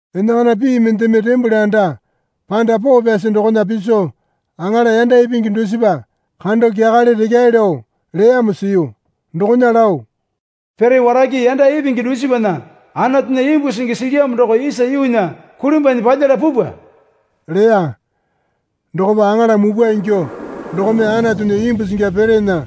Enakana pii mendeme tembole anda panda poo pyasi dokona piso aŋala yanda ipingi dusipa kando kyakale rekyae lao leyamo siyu. Dokona lao, Pere warake yanda ipingi dusipana Anatunya imbu singi silyamo doko isa yuunya kulimbwanyi palyala pupwa leya. Dokopa aŋala mupwa ingyuo dokome Anatunya imbu singi perena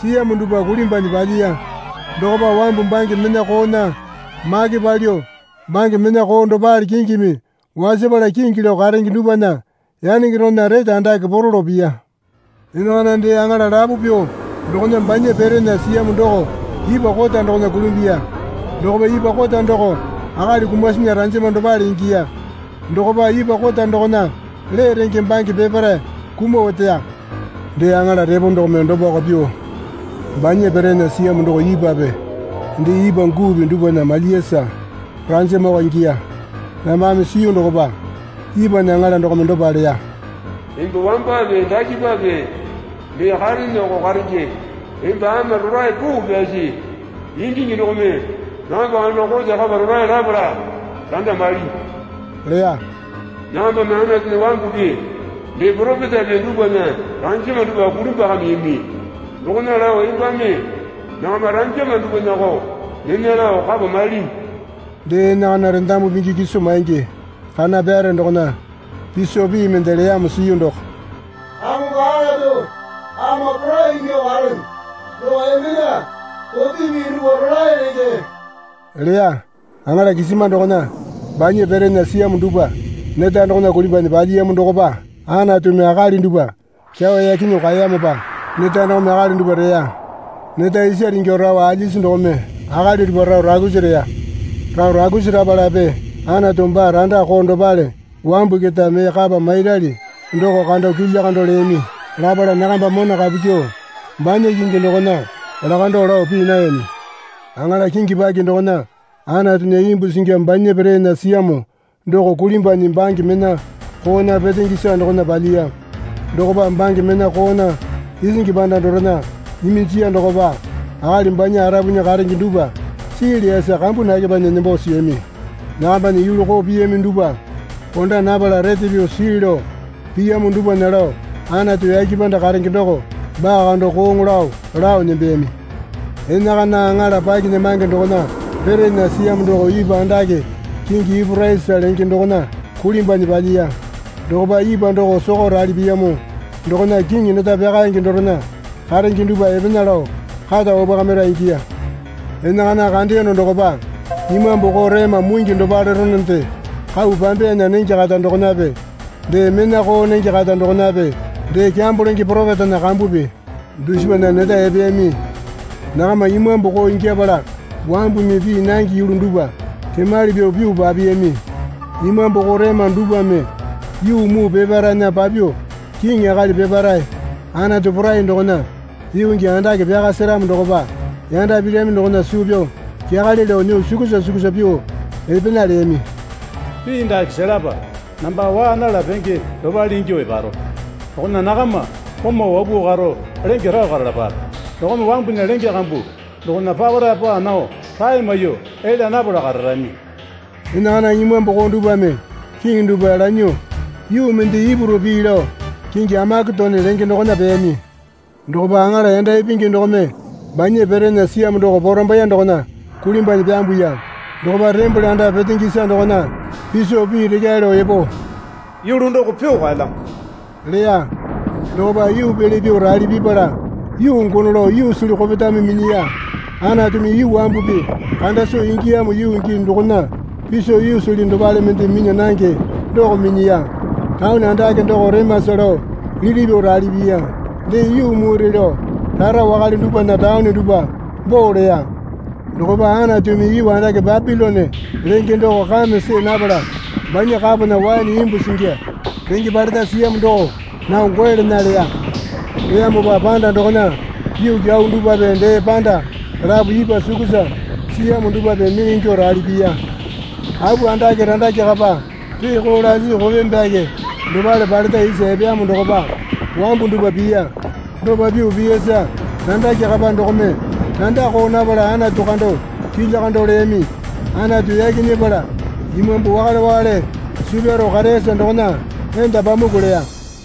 siyamo dupwa kulimbwanyi palyiya. Dokopa wambu bange mena koona make palyuo bange mena koo dopale kingimi wasapala kingi lao karenge dupwana yanenge dokona rete andake poro lao piya. Enakana dee aŋala lapo pyuo dokona banya perena siyamo doko ipwa kota dokona kulimbuya. Dokopa ipwa kota doko akali kumasinya ranjama dopale ingiya. Dokopa ipwa kota dokona lee renge bange peparae kumuo oteya. Dee aŋala repo dokome dopako pyuo banya perena siyamo doko ipwape dee ipwa guupi dupwana malyiyasa ranjamako ingiya. Nambame siyu dokopa ipwana aŋala dokome dopa leya. Emba wambape dakepape mee kareneko karenge. Emba ama rolae poo pyasi ingingi dokome nakamba kando kote kapa rolae lapala randa mailyinyi leya. Nakambame Anatunya wambupi dee poropetape dupwana ranjama dupwa kulimbwakamiyami. Dokona lao embame nakama ranjama dupwanako nena lao kapa mailinyi. Dee enakana rendamu pingi kiso maingi kana pyare dokona piso pii mende leyamo siyu doko, Kamongo Anatu Ama Porai ingyuo karene doko embena kote pii dupwa rolae lenge leya. Aŋala kisima dokona banya perena siyamo dupwa neta dokona kulimbwanyi palyiyamo dokopa Anatumi akali dupwa kyawa yaki nyuo kaeyamopa neta dokome akali dupwa reya. Neta isare ingyuo rao alyasi dokome akali dupwa rao raukusi reya. Rao raukusi rapalape Anatu baa randa koo dopale wambu keta mee kapa mairali doko kando kilya kando leyami. Lapala nakamba mona kapu kyuo banya kingi dokona lakandao lao pii nayami. Aŋala kingi paki dokona Anatunya imbu singi banya perena siyamo doko kulimbwanyi bange mena koona petenge isa dokona palyiya. Dokopa bange mena koona isingi panda dorena iminjiya dokopa akali banya arapunya karenge dupwa sii leyasa kambu nakepanyi nembo siyami. Nakambana yulu koo piyami dupwa konda napala rete pyuo sii lao piyamo dupwana lao Anatu yake panda karenge doko baa kando kooŋo lao lao nembeyami. Enakana aŋala pakinyamange dokona perena siyamo doko ipwa andake kingi Yuporisa lenge dokona kulimbwanyi palyiya. Dokopa ipwa doko soko rali piyamo dokona kiŋi neta pyakaenge dorena karenge dupwa epena lao kata wapwakamira ingiya. Enakana kandeyono dokopa imambu koo rema mungi dopaleronende kau pambeyana nenge kata dokonape dee mena koo nenge kata dokonape dee kyambo lenge poropetana kambupi dusipana neta epeyami. Nakama imambu koo ingyapala wambumi pii nange yulu dupwa kemali pyuo pyuo papiyami. Imambu koo rema dupwame yuu muu peparaena papyuo kiŋi akali peparae Anatu Porai dokona yuu gii andake pyaka seramo dokopa yanda pirami dokona suu pyao kyakale lao nyuo sukusa sukusa pyuo epena leyami. Pii dake selapa. Namba waa nala penge dopale ingyuo eparo. Dokona nakama komau wapuo karo lenge rao karalapape. Dokome wambunya lenge kambu dokona papara paa nao rae maiyuo elya napala kararami. Enakana imambu koo dupwame kiŋi dupwa lanyuo yuu mende Ipuru pii lao kingi Amaketono lenge dokona peyami. Dokopa aŋala yanda ipingi dokome banya perena siyamo doko porambaiye dokona kulimbwanyi pyambuya. Dokopa tembole anda petenge isa dokona piso pii rekyae lao epo, Yulu doko pyuo kaelyamo leya. Dokopa yuu pele pyuo rali pipala yuu gono lao yuusili kopetame minyiya. Anatumi yuu wambupi kanda soo ingiyamo yuu gii dokona piso yuusili dopale mende minya nange doko minyiya. Taone andake doko remasa lao liti pyuo rali piya. Dee yuu mure lao rara wakale dupwana taone dupwa boo leya. Dokopa Anatumi yuu andake Bapilone lenge doko kame see napala banya kapona waene imbu singi renge paleta siyamo doko nao goe lena leya. Leyamopa panda dokona yuu kyau dupwape dee panda lapo ipwa sukusa siyamo dupwape mee ingyuo rali piya. Apu andake randake kapa reeko lasi kope byake dopale paleta isa epeyamo dokopa wambu dupwa piya. Dopa pyuo piyasa randake kapa dokome randa koo napala Anatu kando kilya kando leyami. (Anatu yaki nyepala imambu wakale wakale suu pyaro kareyasa dokona enda pamuku leya.)